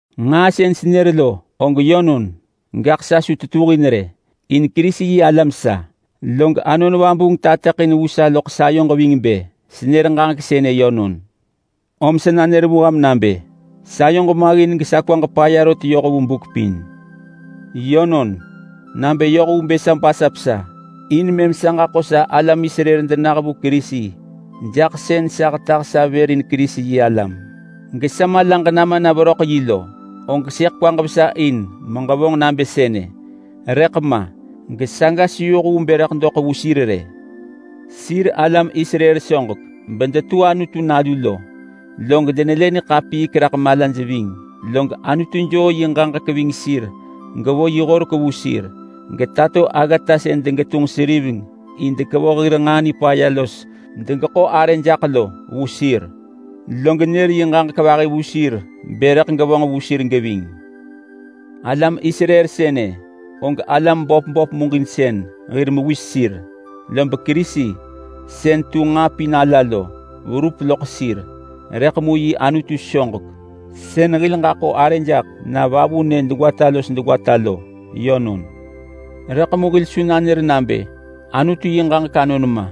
Nġaa sën senër lo og yönon, gaḳ sa su tetuhin rë, in Kerisi-yi-alam sa. Log Anon Vabuung tateḳin vu sa loḳ sayoġ ving bë senër ġaġek sënë yönon. Sa nanër vu ham nabë: Sayoġ maggin gesa kwaġ paya rot yoh vu buk pin. Yönon, nabë yoh vu bë sa basap sa in mëm sa ġaḳo sa alam Israel denah vu Kerisi jaḳ sën sa hetah sa vër in Kerisi-yi-alam gesa malaġ nama na veröḳ yi lo, og sëḳ kwaġ vesa in meġevonġ nabë sënë. Rëḳ ma gesaga su yoh vu bë rëḳ doḳ vu sir rë. Sir alam Israel soġek bedetu Anutu nalu lo, log denelë niḳapiik raḳ malaj ving, log Anutu joo yi ġaġek ving sir gevo yi horek vu sir. Getato aggata sën degetunġ seriveng in bë dekevoh hir nġaa nipaya los degeḳo arë jaḳ lo vu sir. Log nër yi ġaġek vahi vu sir bë rëḳ gevonġ vu sir geving. Alam Israel sënë og alam böp böp wirek hen hir mewis sir, lob Kerisi sën tu nġaa pin ala lo pum raḳ sir, rëḳ mu yi Anutu soġek, sën hil ġaḳo arë jaḳ na vavunë degwata los degwata lo yönon. Rëḳ mu hil su nanër nabë: Anutu hen ġaġek anon ma.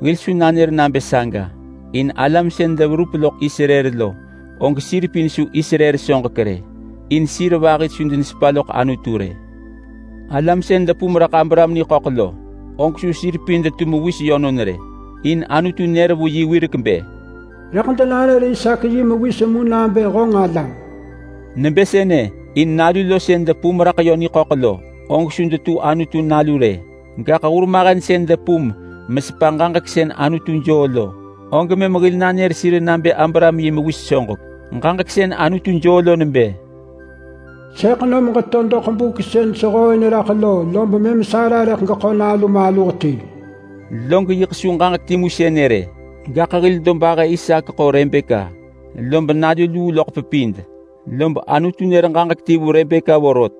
Hil su nanër nabë saga in alam sën depum raḳ Israel lo, og sir pin su Israel soġek rë. In sir vahi su denesepa loḳ Anutu rë. Alam sën depum raḳ Abraham niḳöḳ lo, og su sir pin detu yi mewis yönon rë. In Anutu nër vu yi wirek bë, “Rëḳ denanër Isaak yi mewis mu nabë honġ alam.” Nebë sënë in nalu lo sën depum raḳ niḳöḳ mu lo, og su detu Anutu nalu rë. Gaḳ hurmahen sën depum raḳ ġaġek sën Anutu joo lo, og mëm hil nanër sir nabë Abraham yi mewis soġek. Ġaġek sën Anutu joo lo nebë, “Sëḳ nom ġeto doḳ buk sën sehooin raḳ lo, lom mëm Sara rëḳ geḳo nalu maluh ti.” Log yiḳ su ġaġek timu sënë rë. Gaḳ hil dobahë Isaak ḳo Rebeka, lob nalu luu loḳ pepid, lob Anutu nër ġaġek ti vu Rebeka vorot.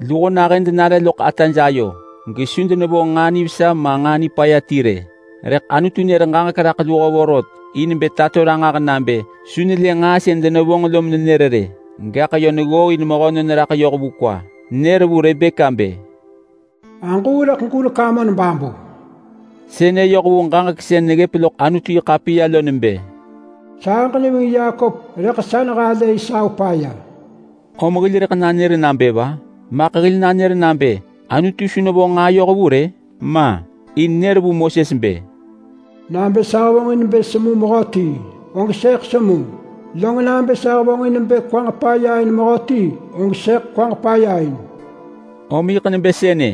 Luho nahën denare loḳ ataj ayo gesu denevonġ nġaa nivesa ma nġaa nipaya ti rë, rëḳ Anutu nër ġaġek raḳ luho vorot in bë tato ranġah nabë su nelë nġaa sën denevonġ lo menenër rë, gaḳ yö neggooin mehönon raḳ yoh vu kwa. Nër vu Rebeka bë, “Aġuu rëḳ gurek amon babu!” Sënë yoh vu ġaġek sën neggëp loḳ Anutu-yi-ḳapiya lo nebë, “Sahëġ neving Yakop, rëḳ sa nehalë Esau paya.” Om hil rëḳ nanër nabë va? Maḳ hil nanër nabë: Anutu su nevonġ nġaa yohvu rë? Ma! In nër vu Moses bë: “Nabë sa hevonġin bë semu mehöti, og sëḳ semu. Log nabë sa hevonġin bë kwaġ paya in mehöti, og sëḳ kwaġ paya in.” Om yiḳ nebë sënë.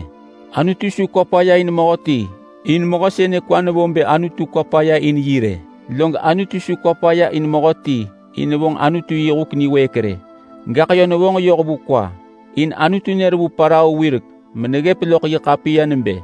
Anutu su kwa paya in mehöti in mehö sënë kwa nevo bë Anutu kwa paya in yi rë. Log su kwa paya in mehöti in nevonġ Anutu yi huk niwëëk rë, gaḳ yö nevonġ yoh vu kwa. In Anutu nër vu Parao wirek meneggëp loḳ yi ḳapiya nebë,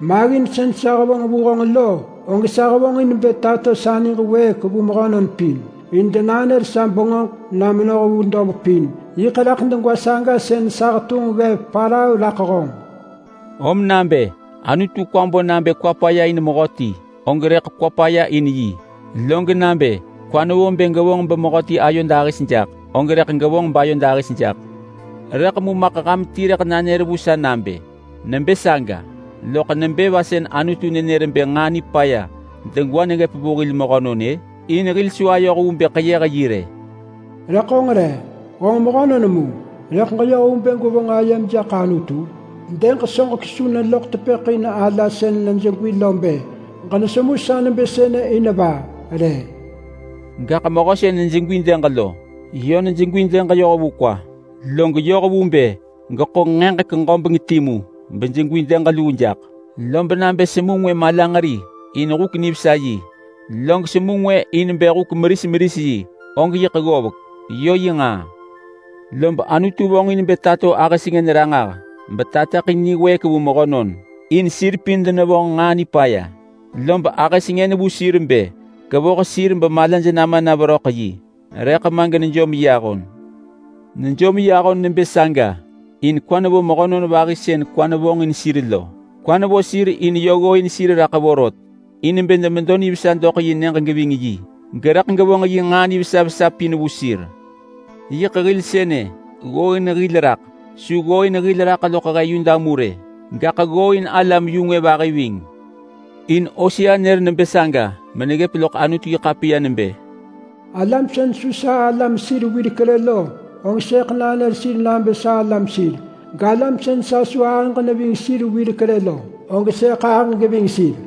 “Maggin sën sa hevonġ vu honġ lo, og sa hevonġ in bë tato sa niġ wëëk vu mehönon pin in denanër sa bengöġ na menoh vu dob pin. Yiḳ raḳ degwa saga sën sa hetunġ ggev Parao raḳ honġ.” Om nabë Anutu kwa bo nabë kwa paya in mehöti, og rëḳ kwa paya in yi. Log nabë kwa nevo bë gevonġ bemehöti ayo dahis jaḳ, og rëḳ gevonġ bayo dahis jaḳ. Rëḳ mu maḳ ham ti rëḳ nanër vu sa nabë, “Nebë saga, loḳ nebë va sën Anutu nenër bë nġaa nipaya degwa neggëp vu hil mehönon-ë? In hil su ayoh vu bë ḳeyëh yi rë.” Rëḳ honġ re? Honġ mehönon mu rëḳ ġeyoh vu bë gwevonġ ayem jaḳ Anutu? Dëg soġek su neloḳ tepëḳ in ala sën nejegwi yi lo bë, “Ġenesemu sa nebë sënë in va?” rë. Gaḳ mehö sën nejegwi dëg lo yö nejegwi yoh vu kwa, log yoh vu bë geḳo nġaġek ġobeng timu mejegwi dëg luu jaḳ. Lob nabë semu ngwë malanġeri in huk nivesa yi, log semu ngwë in bë huk meris meris yi, og yiḳ ggovek. Yö yi nġaa. Lob Anutu vonġin bë tato ahë sengën ranġah betateḳin niwëëk vu mehönon in sir pin denevonġ nġaa nipaya. Lob ahë sengën vu sir bë kevoh sir bemalaj nama na veröḳ yi, rëḳ ma genejom yi ahon. Nejom yi ahon nebë saga in kwa nevo mehönon vahi sën kwa nevonġin sir lo. Kwa nevo sir in yö ggooin sir raḳ vorot in bë demedo nivesa doḳ yi nyëġ geving yi, gerëḳ gevonġ yi nġaa nivesa vesa pin vu sir. Yiḳ hil sënë. Ggooin hil raḳ. Su ggooin loḳ he Yuda mu rë, gaḳ ggooin alam-yu-ngwë vahi ving. In Hosea nër nebë saga meneggëp loḳ Anutu-yi-ḳapiya nebë: “Alam sën su sa alam sir wirek rë lo, og sëḳ nanër sir nabë salam sir. Galam sën sa su ahëġ neving sir wirek rë lo, og sëḳ ahëġ geving sir.”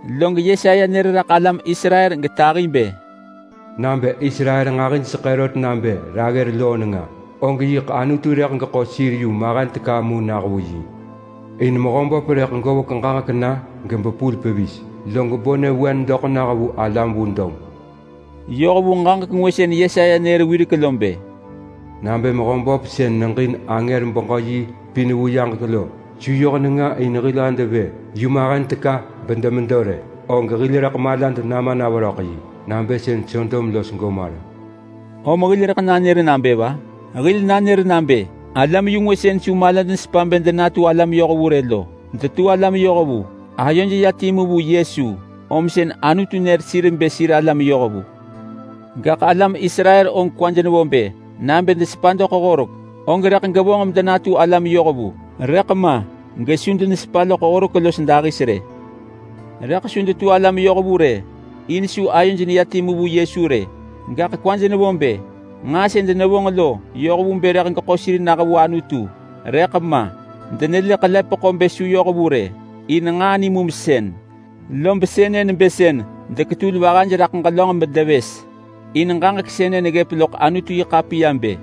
Log Yesaya nër raḳ alam Israel getahi bë: “Nabë Israel nġahijseḳë rot nabë raggër loo nenga, og yiḳ Anutu rëḳ geḳo sir yu mahen teka mu nah vu yi. In Mehöböp rëḳ govek ġaġek na gebepul pevis, log bo nyëvewen doḳ nah vu alam vu dob.” Yoh vu ġaġek ngwë sën Yesaya nër wirek lo bë: “Nabë Mehöböp sën neġin angër-beġö-yi pin vu yaġek lo su yoh nenga in hil hed vë yu mahen teka bedemedo rë, og hil rëḳ malad nama na veröḳ yi nabë sën Sodom los Gomora.” Om hil rëḳ nanër nabë va? Hil nanër nabë alam-yu-ngwë sën su malaj nesepa bë denatu alam yohvu rë lo detu alam yohvu. Ayoj ya timu vu Yesu lom sën Anutu nër sir bë sir alam yohvu. Gaḳ alam Israel og kwaj nevo bë nabë desepa doḳ horek, og rëḳ gevonġ medenatu alam yohvu. Rëḳ ma gesu denesepa loḳ horek los dahis rë. Rëḳ su detu alam yohvu rë, in su ayoj neya timu vu Yesu rë. Gaḳ kwaj nevo bë nġaa sën denevonġ lo yoh vu bë rëḳ geḳo sir nah vu Anutu, rëḳ ma. Denelë ḳelepeḳo nebë su yoh vu rë, in nġaa nimumsën, lob sënë nebë sën deketul vahaj raḳ ġelönġ bedevës. In ġaġek sënë neggëp loḳ Anutu-yi-ḳapiya bë: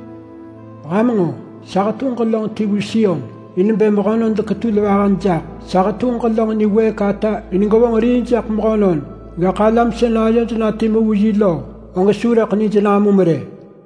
“Ham nġo! Sa hetunġ ġelönġ ti vu Sion in bë mehönon deketul vahaj jaḳ. Sa hetunġ ġelönġ niwëëk ata in gevonġ rii jaḳ mehönon. Gaḳ alam sën ayoj na timu vu yi lo, og su rëḳ nij namum rë.”